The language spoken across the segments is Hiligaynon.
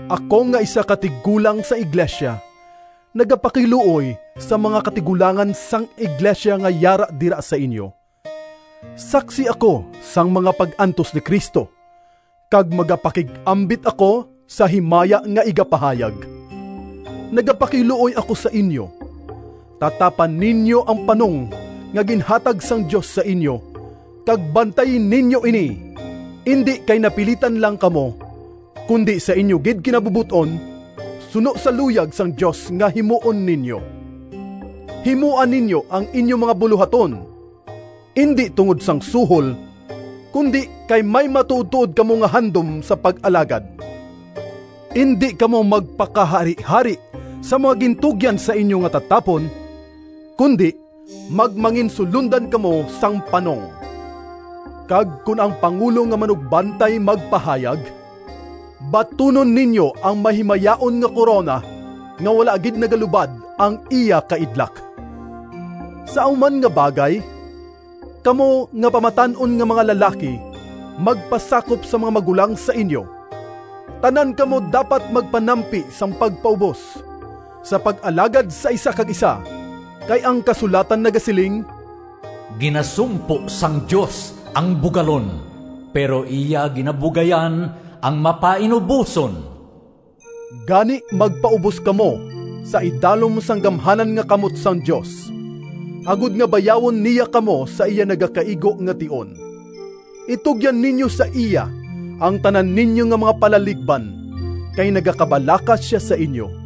Ako nga isa ka tigulang sang iglesia, nagapakiluoy sa mga katigulangan sang iglesia nga yara dira sa inyo. Saksi ako sang mga pag-antos ni Cristo, kag magapakig-ambit ako sa himaya nga igapahayag. Nagapakiluoy ako sa inyo: tatapa ninyo ang panong nga ginhatag sang Dios sa inyo, kag bantayi ninyo ini indi kay napilitan lang kamo, kundi sa inyo gid kinabubot-on, suno sa luyag sang Dios nga himuon ninyo. Himoa ninyo ang inyo mga bulohaton, indi tungod sang suhol, kundi kay may matuodtuod kamo nga handom sa pag-alagad. Indi kamo magpakaharihari sa mga gintugyan sa inyo nga tatapon, kundi magmanginsulondan kamo sang panong. Kag kon ang Pangulo nga Manugbantay magpahayag, batunon ninyo ang mahimayaon nga korona nga wala gid nagalubad ang iya kaidlak. Sa amo man nga bagay, kamo nga pamatan-on nga mga lalaki magpasakop sa mga magulang sa inyo. Tanan kamo dapat magpanampi sang pagpaubos, sa pag-alagad sa isa kag isa, kay ang kasulatan nagasiling, “Ginasumpo sang Dios ang bugalon, pero iya ginabugayan ang mapainuboson.” Gani magpaubos kamo sa idalom sang gamhanan nga kamot sang Dios, agod nga bayawon niya kamo sa iya nagakaigo nga tion. Itugyan ninyo sa iya ang tanan ninyo nga mga palaligban, kay nagakabalaka sia sa inyo.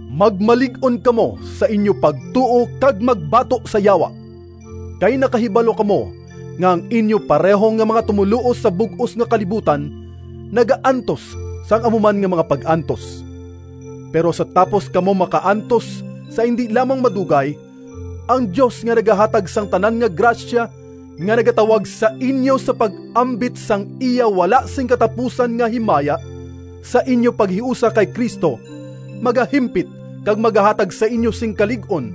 Magmalig-on kamo sa inyo pagtuo kag magbato sa Yawa, kay nakahibalo kamo nga ang inyo pareho nga mga tumoluo sa bug-os nga kalibutan nagaantos sang amo man nga mga pag-antos. Pero sa tapos kamo makaantos sa indi lamang madugay, ang Dios nga nagahatag sang tanan nga grasya, nga nagatawag sa inyo sa pag-ambit sang iya wala sing katapusan nga himaya sa inyo paghiusa kay Cristo, magahimpit kag magahatag sa inyo sing kalig-on,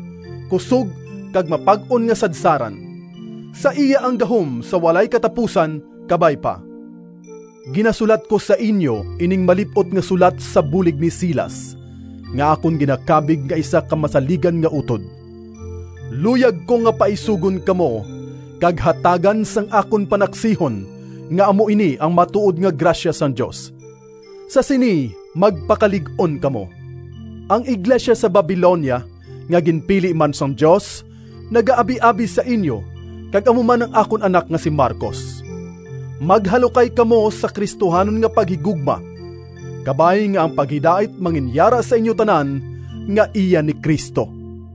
kusog kag mapag-on nga sadsaran. Sa iya ang gahom sa walay katapusan. Kabay pa. Ginasulat ko sa inyo ining malip-ot nga sulat sa bulig ni Silas, nga akon ginakabig nga isa ka masaligan nga utod. Luyag ko nga paisugon kamo kag hatagan sang akon panaksihon nga amo ini ang matuod nga grasya sang Dios. Sa sini magpakalig-on kamo. Ang iglesia sa Babilonia, nga ginpili man sang Dios, nagaabiabi sa inyo, kag amo man ang akon anak nga si Marcos. Maghalukay kamo sa Cristohanon nga paghigugma. Kabay nga ang paghidait manginyara sa inyo tanan nga iya ni Cristo.